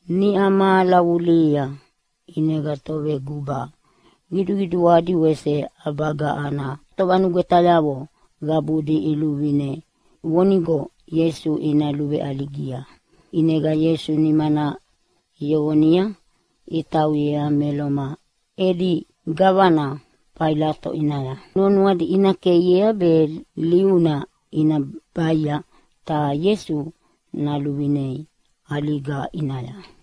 Niʼa mahala vulihia ʼinega toveguba qiduqiduadi wese ʼabaga ana tovanugwetayavo qabudi iluvine vonigo Ieisu ina luveʼaligia. ʼInega Ieisu nimana iyoqonia itauyea me Loma edi gavana Failato ʼinaya nuanuadi ina keiea be liuna ina baia ta Ieisu naluvinei ʼaliga ʼinaya.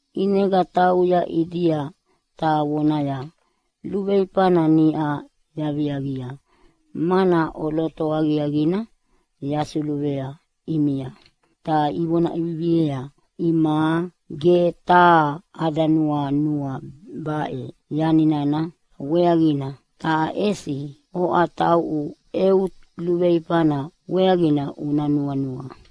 ʼinega tauya ʼidia ta vonaya, “luveifana niʼa yaviaqia, mana ʼoloto aqiaqina yasuluvea ʼimia.” Ta ivona ʼeviviea, “Imaʼa ge taha ada nuanua baʼe yani nana weaqina, ta ʼesi oʼa tauʼu eu luveifana weaqina una nuanua.”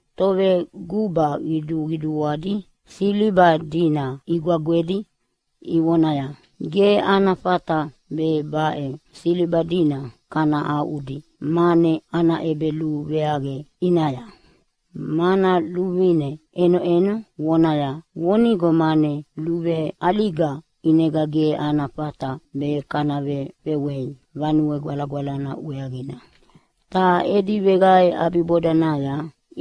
Toveguba qiduqiduadi siliba dina igwagwedi ivonaya, “Ge ana fata be baʼe siliba dina kana aʼudi mane ana ʼebeluveaqe ʼinaya, mana luvine ʼenoʼeno vonaya vonigo mane luveʼaliga ʼinega ge ana fata be kana vefewei Vanue Gwalagwalana weaqina.” Ta edi veqae ʼabibodanaya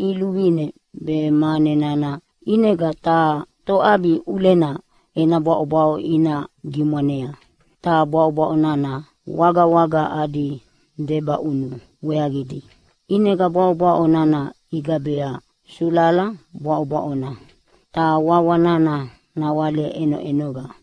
iluvine be mane nana ʼinega taha toʼabi ʼulena ena bwaʼobwaʼo ina gimwanea, ta bwaʼobwaʼo nana wagawaga adi debaʼunu weaqidi. ʼInega bwaʼobwaʼo nana igabea Sulala Bwaʼobwaʼona, ta wawa nana nawale ʼenoʼenova.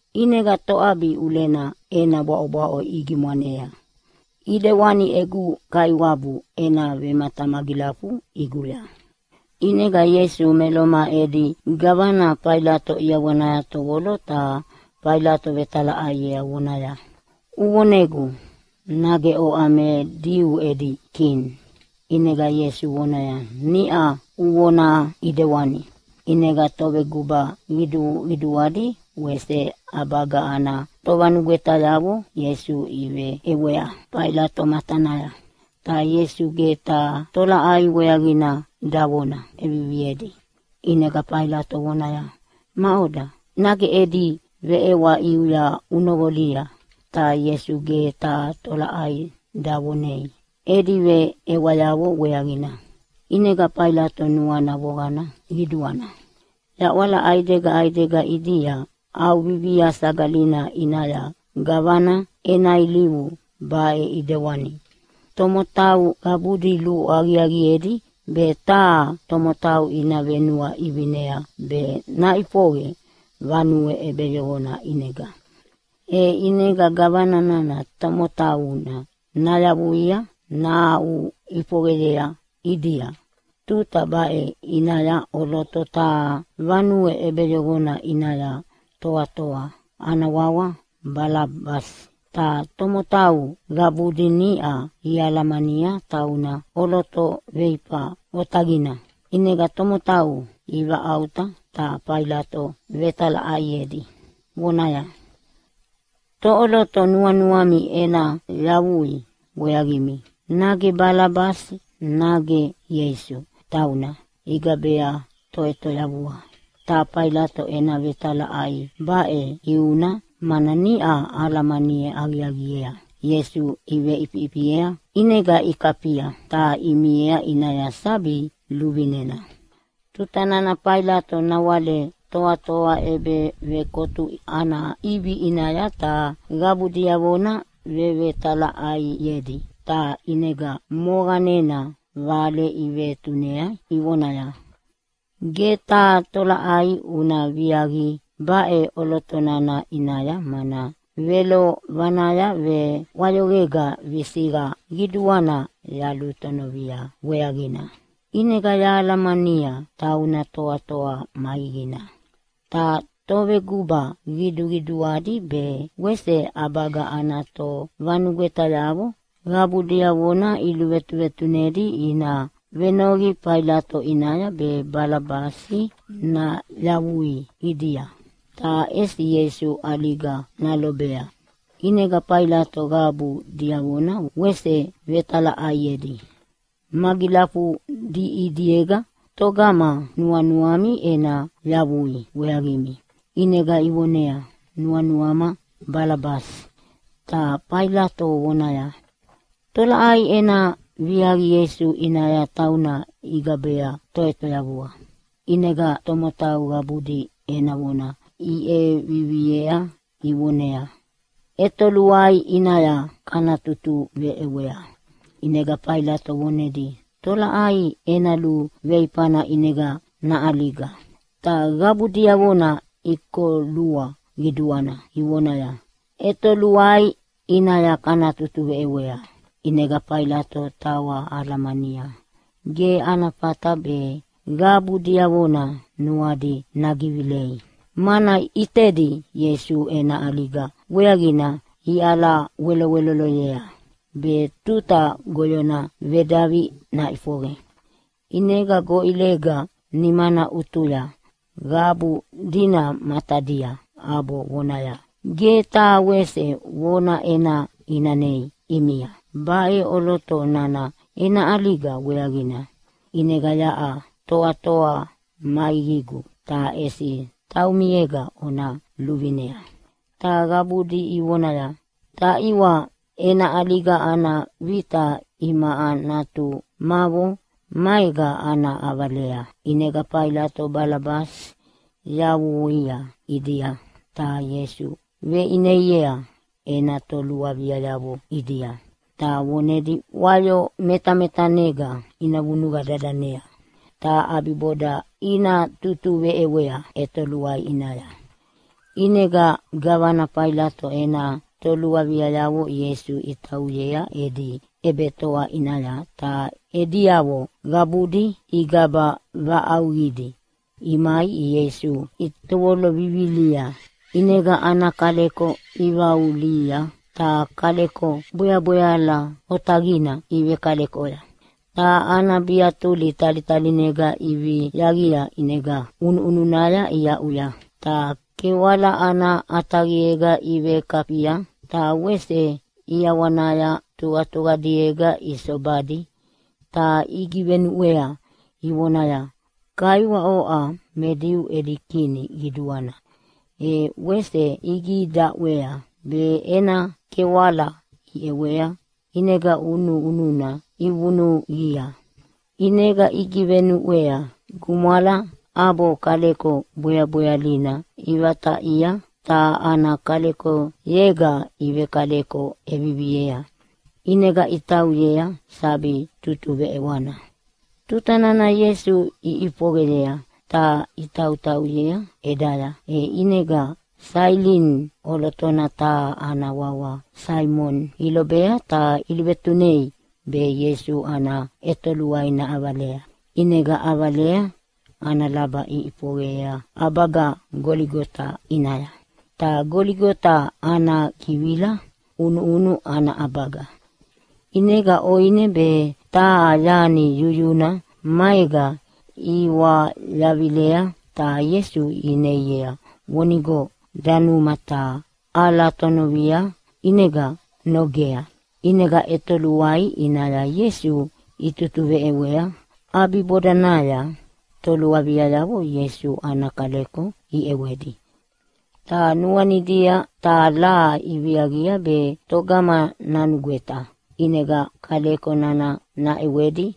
ʼinega toʼabi ʼulena ena bwaʼobwaʼo igimwanea, ʼidewani egu Kaiwabu ena vematamagilafu ʼiguya.” ʼInega Ieisu me Loma edi gavana Failato ʼiawanaya tovolo ta Failato vetalaʼaiea vonaya, “Uvonegu, nage oʼa me Diu edi Kini?” ʼInega Ieisu vonaya, “Niʼa uvona ʼidewani.” ʼInega toveguba qiduqiduadi wese ʼabaga ana tovanugwetayavo Ieisu iveʼewea Failato matanaya, ta Ieisu ge taha tolaʼai weaqina davona ʼeviviedi. ʼInega Failato vonaya, “Maʼoda, nage edi veʼewa ʼiuya unoqolia?” Ta Ieisu ge taha tolaʼai davonei edi veʼewayavo weaqina, ʼinega Failato nuana voqana qiduana. Yaʼwala ʼaidega ʼaidega ʼidia ʼAuvivia Sagalina ʼinaya gavana ena ilivu baʼe ʼidewani: Tomotau qabudi luaqiaqiedi be taha tomotau ina venuaʼivinea be naʼifoqe vanue ʼebeyoqona ʼinega, e ʼinega gavana nana tomotauna nayavuia nahaʼuʼifoqeyea ʼidia. Tuta baʼe ʼinaya ʼoloto taha vanue ʼebeyoqona ʼinaya toatoa ana wawa Balabasi, ta tomotau qabudi niʼa ialamania tauna ʼoloto veifa otaqina. ʼInega tomotau ivaʼauta ta Failato vetalaʼaiedi vonaya, “Toʼoloto nuanuami ena yavui weaqimi, nage Balabasi nage Ieisu tauna igabea Toʼetoyavua?” Ta Failato ena vetalaʼai baʼe ʼiuna, mana niʼa alamani aqiaqiea Ieisu iveʼifiʼifiea, ʼinega ikafia ta imiea ʼinaya sabi luvinena. Tuta nana Failato nawale toatoa ʼebevekotu ana ʼivi ʼinaya ta qabu diavona vevetalaʼaiedi, ta ʼinega moqanena vale ivetunei ivonaya, “Ge taha tolaʼai una viaqi baʼe ʼoloto nana ʼinaya, mana velovanaya veʼwayoqega visiqa qiduana yalutonovia weaqina, ʼinega yahalamania tauna toatoa maiqina.” Ta toveguba qiduqiduadi be wese ʼabaga ana tovanugwetayavo qabu diavona iluvetuvetunedi ina venoqi Failato ʼinaya be Balabasi nayavui ʼidia ta ʼesi Ieisu ʼaliga nalobea. ʼInega Failato qabu diavona wese vetalaʼaiedi, “Magilafudi ʼidiega togama nuanuami ena yavui weaqimi?” ʼInega ivoneaya, “Nuanuama Balabasi!” Ta Failato vonaya, “Tolaʼai ena viaqi Ieisu ʼinaya, tauna igabea Toʼetoyavua?” ʼInega tomotau qabudi ena vona iveʼevivia ivonaya, “ʼEtoluai ʼinaya kana tutuveʼewea!” ʼInega Failato vonedi, “Tolaʼai ena luveifana ʼinega naʼaliga?” Ta qabu diavona ikolua qiduana ivonaya, “ʼEtoluai ʼinaya kana tutuveʼewea!” ʼInega Failato tawa alamania ge ana fata be qabu diavona nuadi nagivilei, mana ʼitedi Ieisu ena ʼaliga weaqina iʼalaweloweloloyea be tuta goyona vedavi naʼifoqe. ʼInega goʼilega nimana ʼutuya qabu dina matadia ʼabo vonaya, “Ge taha wese vona ena ʼinanei ʼimia baʼe ʼoloto nana ena ʼaliga weaqina. ʼInega yaʼa toatoa maiqigu, ta ʼesi taumiega ona luvinea.” Ta qabudi ivonaya, “Taʼiwa, ena ʼaliga ana vita imaʼa natumavo maega ana ʼavalea.” ʼInega Failato Balabasi yavuia ʼidia, ta Ieisu veʼineiea ena toluaviayavo ʼidia ta vonedi wayo metametanega ina vunuqa dadanea, ta ʼabiboda ina tutuveʼewea ʼetoluai ʼinaya. ʼInega gavana Failato ena toluaviayavo Ieisu itauyea edi ʼebetoa ʼinaya, ta ediavo qabudi igaba vaʼauqidi imai Ieisu itovolo vivilia. ʼInega ana kaleko ivaulia ta kaleko bweabweala otaqina ivekalekoya, ta ana biatuli talitaliega iviaqia ʼinega ʼunuʼununaya iaʼuya, ta kewala ana ʼataqiega ivekafia ta wese ʼiawanaya tuqatuqadiega isobadi ta igivenuʼwea ivonaya, “Kaiwa, oʼa me Diu edi Kini Qiduana.” E wese igidaʼwea be ena kewala iʼewea ʼinega ʼunuʼununa ivunuqia. ʼInega igivenuʼwei gumwala ʼabo kaleko bweabwealina ivataʼia ta ana kalekoyega ivekaleko ʼeviviea, ʼinega itauyea sabi tutuveʼewana. Tuta nana Ieisu iʼifoqeyei ta itautauyea ʼedaya e ʼinega Sailini ʼolotona taha ana wawa Saimoni ilobea, ta iluvetunei be Ieisu ana ʼetoluai naʼavalea. ʼInega ʼavalea ana laba iʼifoqe ʼabaga Goligota ʼinaya, ta Goligota ana givila “ʼUnuʼunu ana ʼabaga”. ʼInega ʼoine be taha yani yuyuna maega iwayavilea ta Ieisu ineia vonigo danuma, ta ʼalatonovia ʼinega nogea. ʼInega ʼetoluai ʼinaya Ieisu itutuveʼewea. ʼAbibodanaya toluaviayavo Ieisu ana kaleko iʼewedi ta nuanidia taha laha iviaqia be togama nanugweta ʼinega kaleko nana naʼewedi.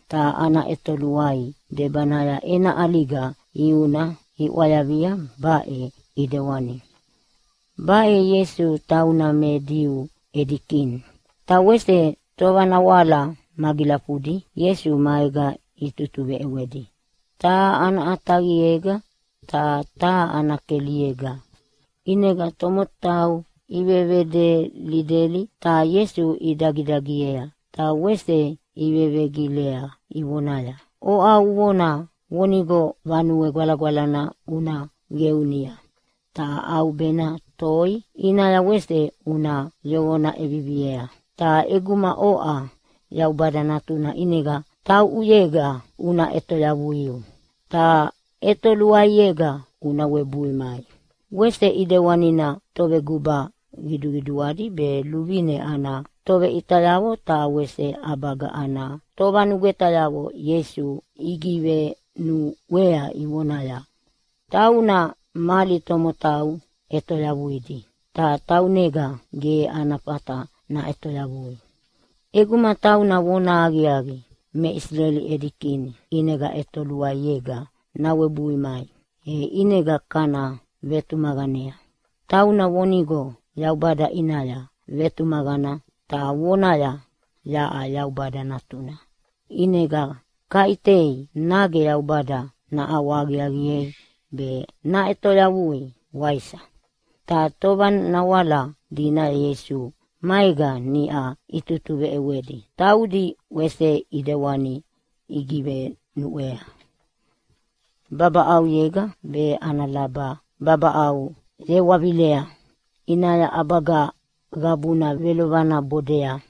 Ta ana ʼetoluai debanaya ena ʼaliga ʼiuna iʼwayavia baʼe ʼidewani, Baʼe Ieisu tauna me Diu edi Kini Ta wese tovanawala magilafudi Ieisu maega itutuveʼewedi, taha ana ʼataqiega ta taha ana keliega. ʼInega tomotau ivevedelideli ta Ieisu idagidagiei ta wese ivevegilea ivonaya, “Oʼa uvona vonigo Vanue Gwalagwalana una qeunia, ta ʼaubena toi ʼinaya wese una yoqona ʼeviviea. Ta ʼeguma oʼa Yaubada Natuna ʼinega tauʼuyega una ʼetoyavuiu ta ʼetoluaiega una webui mai.” Wese ʼidewanina toveguba qiduqiduadi be luvine ana toveʼitayavo ta wese ʼabaga ana tovanugwetayavo Ieisu igivenuʼwea ivonaya, “Tauna mali tomotau ʼetoyavuidi ta taunega ge ana fata naʼetoyavui. ʼEguma tauna vonahaqiaqi me Isileli edi Kini, ʼinega ʼetoluaiega nawebui mai e ʼinega kana vetumaqanea. Tauna vonigo Yaubada ʼinaya vetumaqana ta vonaya, ‘Yaʼa Yaubada Natuna’, ʼinega kaʼitei nage Yaubada naʼawahaqiaqiei be naʼetoyavuia, waisa?” Ta tovanawala dina Ieisu maega niʼa itutuveʼewedi, taudi wese ʼidewani igivenuʼwea. Babaʼauyega be ana laba babaʼau yewavilea ʼinaya ʼabaga qabuna velovana bodea.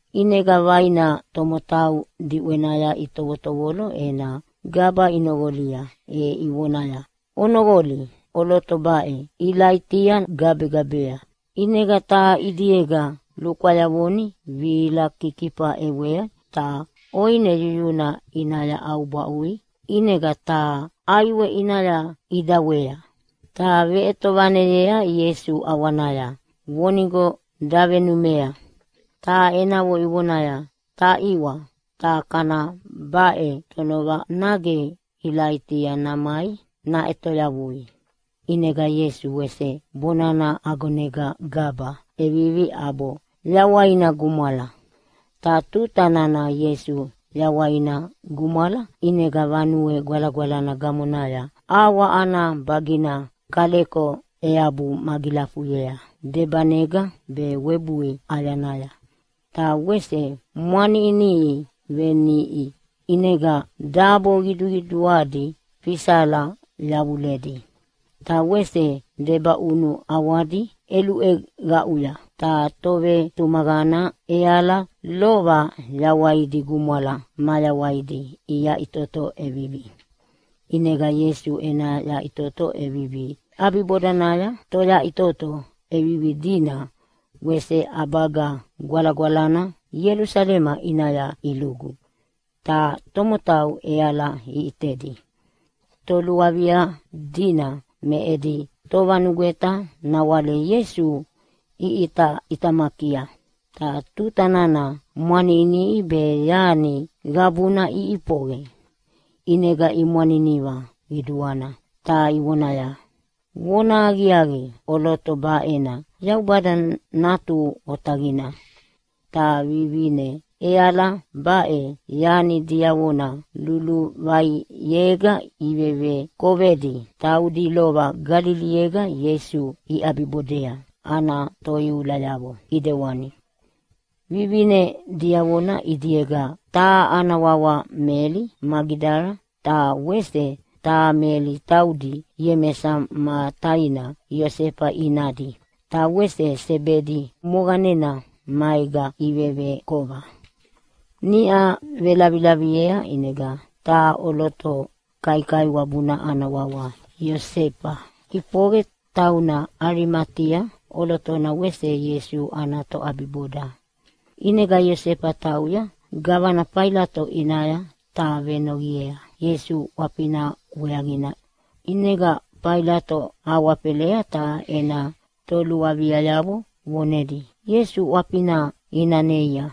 ʼInega vaina tomotau diʼwenaya itovotovolo ena gaba inoqolia e ivonaya, “Onoqoli, ʼoloto baʼe Ilaitia gabegabea.” ʼInega taha ʼidiega lukwayavoni vihila kikifa ʼewei ta ʼoine yuyuna ʼinaya ʼaubwaʼui, ʼinega taha ʼaiwe ʼinaya ʼidawayea ta veʼetovaneyea Ieisu ʼawanaya vonigo davenumea. Ta enavo ivonaya, “Taʼiwa, ta kana baʼe tonova, nage Ilaitia namai naʼetoyavuia.” ʼInega Ieisu wese bonana agonega gaba ʼevivi ʼabo yawaina gumwala. Ta tuta nana Ieisu yawaina gumwala, ʼinega Vanue Gwalagwalana gamonaya ʼawa ana bagina kaleko eabu magilafuyea debanega be webui ʼayanaya ta wese mwaniʼiniʼi veniʼi, ʼinega dabo qiduqiduadi fisala yavuledi, ta wese debaʼunu ʼawadi ʼeluʼeqauya. Ta tovetumaqana ʼeala lova yawaidi gumwala mayawaidi iyaʼitoto ʼevivi. ʼInega Ieisu ena yaʼitoto ʼevivi ʼabibodanaya toyaʼitoto ʼevivi dina wese ʼabaga gwalagwalana Ielusalema ʼinaya ilugu, ta tomotau ʼeala iʼitedi. Toluavia dina me edi tovanugweta nawale Ieisu iʼitaʼitamakia ta tuta nana mwaniʼiniʼi be yani qabuna iʼifoqe, ʼinega imwaniniva qiduana ta ivonaya, “Vonahaqiaqi, ʼoloto baʼena Yaubada Natu Otaqina.” Ta vivine ʼeala baʼe yani diavona luluvaiega ivevekovedi, taudi lova Galiliega Ieisu iʼabibodea ana toiulayavo ʼidewani. Vivine diavona ʼidiega taha ana wawa Meli Magidala, ta wese taha Meli taudi Iemesa ma taina Iosefa inadi. Ta wese Sebedi moqanena maega ivevekova. Niʼa velavilaviea ʼinega taha ʼoloto kaikaiwabuna ana wawa Iosefa ʼifoqe, tauna Alimatia ʼolotona ta wese Ieisu ana toʼabiboda. ʼInega Iosefa tauya gavana Failato ʼinaya, ta venoqiea Ieisu ʼwafina weaqina. ʼInega Failato awafela ta ena toluaviayavo vonedi Ieisu ʼwafina ina neia.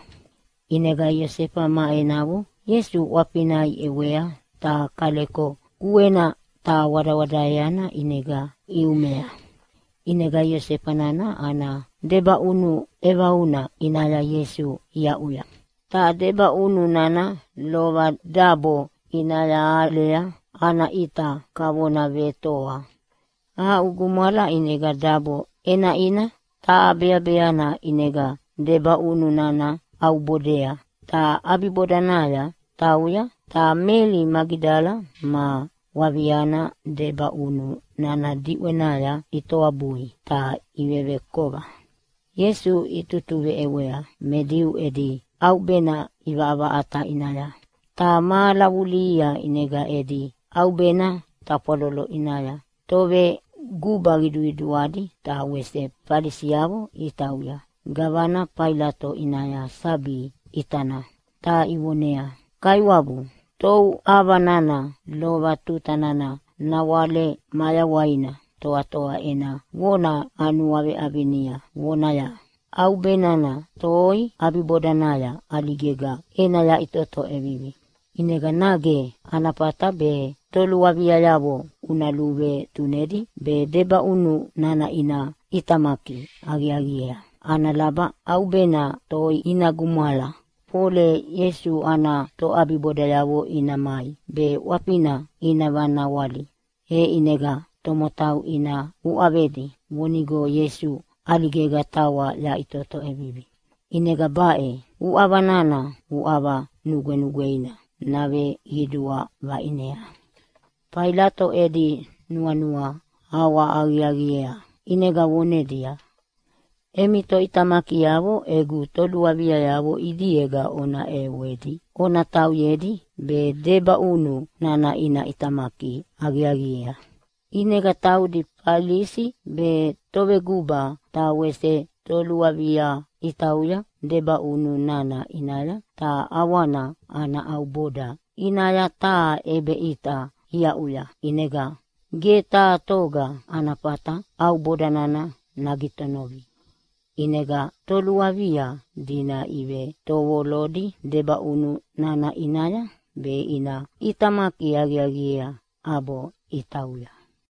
ʼInega Iosefa ma enavo Ieisu ʼwafina iʼewea ta kaleko kuena ta wadawadaeana ʼinega iumea. ʼInega Iosefa nana ana debaʼunu ʼevauna ʼinaya Ieisu aʼuya. Ta debaʼunu nana lova dabo ʼinaya alea ana ʼita kavona vetoa. Aʼu gumwala, ʼinega dabo ʼenaʼina ta beabeana ʼinega debaʼunu nana ʼaubodea, ta ʼabibodanaya tauya. Ta Meli Magidala ma waviana debaʼunu nana diʼwenaya itoabui ta ivevekova. Ieisu itutuveʼewea me Diu edi ʼaubena ʼivaʼavaʼata ʼinaya. Ta mahala vulihia ʼinega edi ʼaubena tafwalolo ʼinaya toveguba qiduqiduadi ta wese Falisiavo itauya gavana Failato ʼinaya sabi ʼitana, ta ivoneaya, “Kaiwabu, touʼava nana lova tuta nana nawale mayawaina toatoa ena vona anuaveʼavinia vonaya, ‘ʼAubena toi ʼabibodanaya ʼaligega ena yaʼitoto ʼevivi.’ ʼInega nage ana fata be toluaviayavo una luvetunedi be debaʼunu nana ina ʼitamaki aqiaqiea ana laba ʼaubena toi ina gumwala, fole Ieisu ana toʼabibodayavo ina mai be ʼwafina ina vanawali, e ʼinega tomotau ina uʼavedi vonigo Ieisu ʼaligega tawa yaʼitoto ʼevivi. ʼInega baʼe uʼava nana uʼava nugwenugweina naveqidua vaʼinea.” Failato edi nuanua ʼawahaqiaqiea, ʼinega vonedia, “Emi toʼitamakiavo egu toluavia ʼidiega ona ʼewedi ona tauyedi be debaʼunu nana ina ʼitamaki aqiaqiea.” ʼInega taudi Falisi be toveguba ta wese toluavia itauya debaʼunu nana ʼinaya ta ʼawana ana ʼauboda ʼinaya taha ʼebeʼita iaʼuya ʼinega ge taha toga ana fata ʼauboda nana nagitonovi. ʼInega toluavia dina ivetovolodi debaʼunu nana ʼinaya be ina ʼitamaki aqiaqiea, ʼabo itauya.